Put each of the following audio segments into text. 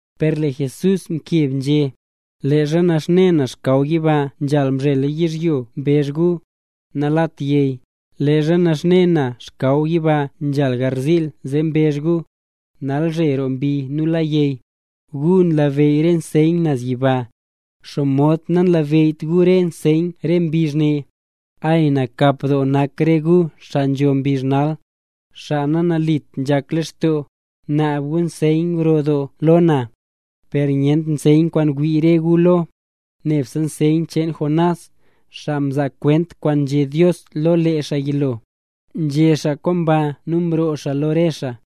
Per lee Jesús mkeb nzhé: —Leezha naxne na xkaw yiba nzhal mzhel yizhyo mbezh gu: “Nalat yey”. Leezha naxne na xkaw yiba nzhal garziil, zee mbezh gu: “Nalzhe roo mbi nu la yey”. Gu nlabeyy re nseyn naz yiba, ¿xomod nanlabeyyt gu re nseyn re mbizh ne? ¡Ay, nakap doo nak re gu xaa nzho re mbizh nal, xaa nanalit nzhak lextoo gu! Naab gu nseyn gro doo lo na, per nyent nseyn kwaan wii re gu lo, nebse nseyn cheen Jonás, xaa mzaa kwent kwaan nzhé Dios lo lee xaa yilo. Nzhé xaa kwaan baa nu mroo xaa lo re xaa.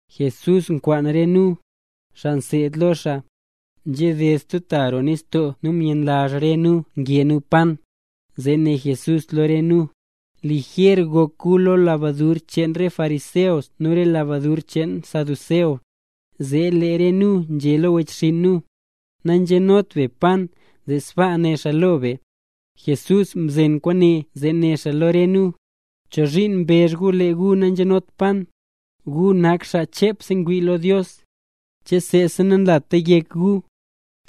Jesús kwaan re nu, xaa mseed lo xaa, nzhaded stub ta roo nistoo nu myenlazh re nu nge nu pan. Zee né Jesús lo re nu: —Lijer gok gu lo lebadur cheen re fariseo nu re xaa saduceo. Zee lee re nu nzhé lo wechxinn nu: —Nanzenot be pan, zee sbaa né xaa lo be. Jesús mzeen kwaane zee né xaa lo re nu: —¿Chozhiin mbezh gu lee gu nanzenot pan? Gu nak xaa chepse ngwii lo Dios. ¿Che seesa nanlata yek gu?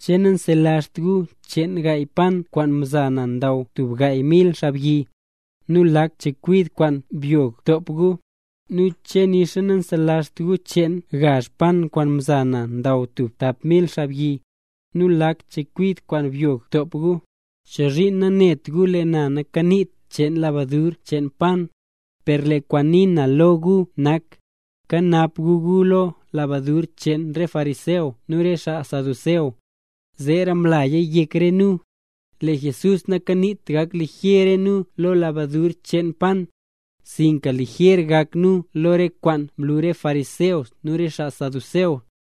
¿Che nanselazht gu cheen gaay pan kwaan mza na ndaw tub gaay mil xaabyi, nu lak chekwid kwaan byog mtop gu? Nu, ¿che nixa nanselazht gu cheen gazh pan kwaan mza na ndaw tub tap mil xaabyi, nu lak chekwid kwaan byog mtop gu? ¿Chozhiin nanet gu lee na nakaniit cheen lebadur cheen pan? Per lee kwaan ngunii na lo gu nak: Kanap gu gu lo lebadur cheen re fariseo nu re xaa saduceo. Zeera mlaya yek re nu, lee Jesús nakaniit gak lijer re nu lo lebadur cheen pan, sinka lijer gak nu lo re kwaan nlu re fariseo nu re xaa saduceo.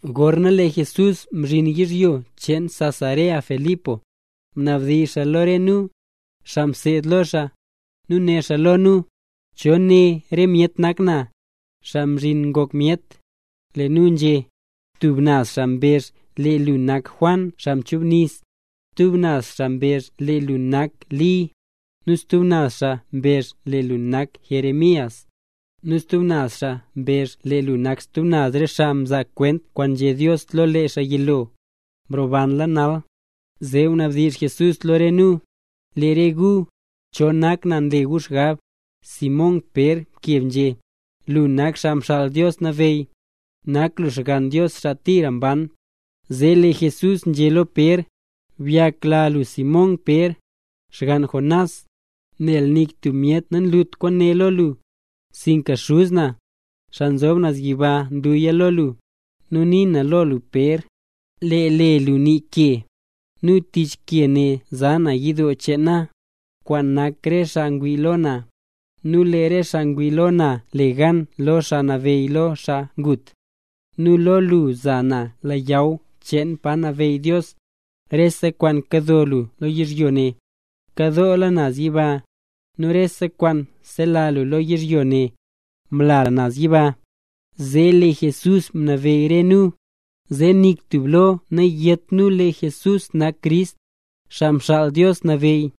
Gorna lee Jesús mzhin yizhyo cheen Cesarea-Filipo, mnabdizh xaa lo re nu, xaa mseed lo xaa, nu né xaa lo nu: —¿Cho né re myet nak na, Xaa Mzhin Ngok Myet? Lee nu nzhé: —Tub naz xaa mbezh lee lu nak Juan xaa mchubnis, stub naz xaa mbezh lee lu nak Li, nu stub naz xaa mbezh lee lu nak Jeremías, nu stub naz xaa mbezh lee lu nak stub re xaa mzaa kwent kwaan nzhé Dios lo lee xaa yilo, mrobanla nal. Zee mnabdizh Jesús lo re nu: —Lee re gu, ¿cho nak na nle re gu xgab? Simón Pér mkeb nzhé: —Lu nak Xaa Mxaal Dios Nabeyy, nak lu Xgann Dios xaa tira mban. Zee lee Jesús nzhé lo Pér: —Byakla lu Simón Pér, xgann Jonás. Nel nik tub myet namlut kwaane lo lu, sinka Xuz na, xaa nzob naz yiba, mluya lo lu. Nu nii na lo lu Pér, lee le lu nii “Ke”, nu tich ke ne za na yidoo cheen na, kwaan nak re xaa ngwii lo na. Nu lee re xaa ngwii lo na le gan lo xaa nabeyy lo re xaa ngut. Nu lo lu za na leyaw cheen pa nabeyy Dios. Rese kwaan kado lu lo yizhyo ne, nkadoola naz yiba; nu rese kwaan sela lu lo yizhyo ne, mlala naz yiba. Zee lee Jesús mnabeyy re nu, zee nik tub lo nayét nu lee Jesús nak Crist, Xaa Mxaal Dios Nabeyy.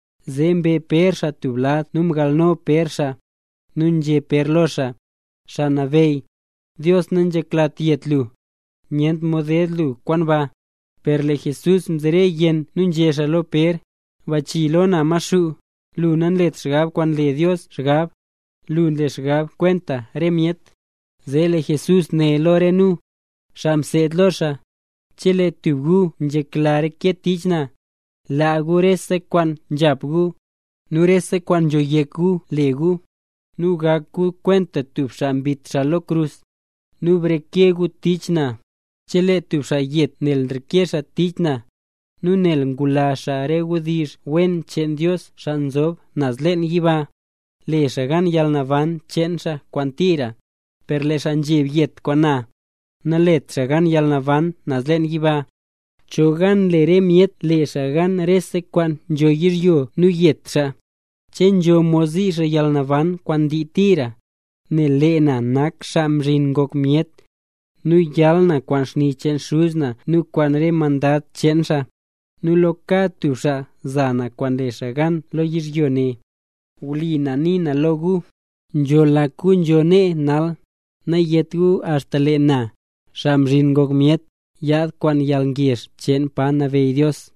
Zee mbe Pér xaa tub lad nu mgalno Pér xaa, nu nzhé Pér lo xaa: —Xaa Nabeyy, Dios nanzheklat yet lu, nyent mod ded lu kwaan ba. Per lee Jesús mzere yenn nu nzhé xaa lo Pér: —¡Bachii lo na Maxuu! Lu nanlet xgab kwaan nle Dios xgab; lu nle xgab kwenta re myet. Zee lee Jesús né lo re nu, xaa mseed lo xaa: —Chelee tub gu nzhekla reke tich na, laa gu rese kwaan nzhap gu, nu rese kwaan nzho yek gu le gu, nu gak gu kwenta tub xaa mbit xaa lo krus, nu breke gu tich na. Chelee tub xaa yet nel nreke xaa tich na, nu nel ngula xaa re wdizh wen cheen Dios xaa nzho naz leen yiba, le xaa gan yalnaban cheen xaa kwaan tira. Per lee xaa nzheb yet kwaan na, nalet xaa gan yalnaban naz leen yiba. ¿Cho gan le re myet le xaa gan rese kwaan nzho yizhyo nu yet xaa? ¿Che nzho mod zii xaa yalnaban kwaan ndii tira? Nel lee na nak Xaa Mzhin Ngok Myet, nu yal na kwaan xni cheen Xuz na nu kwaan re mandad cheen xaa. Nu lo kad tub xaa za na kwaan mle xaa gan lo yizhyo ne. Wli na nii na lo gu, nzho lak gu nzo nee nal, nayeta axta lee na, Xaa Mzhin Ngok Myet, yaad kwaan yalngezh cheen pa nabeyy Dios.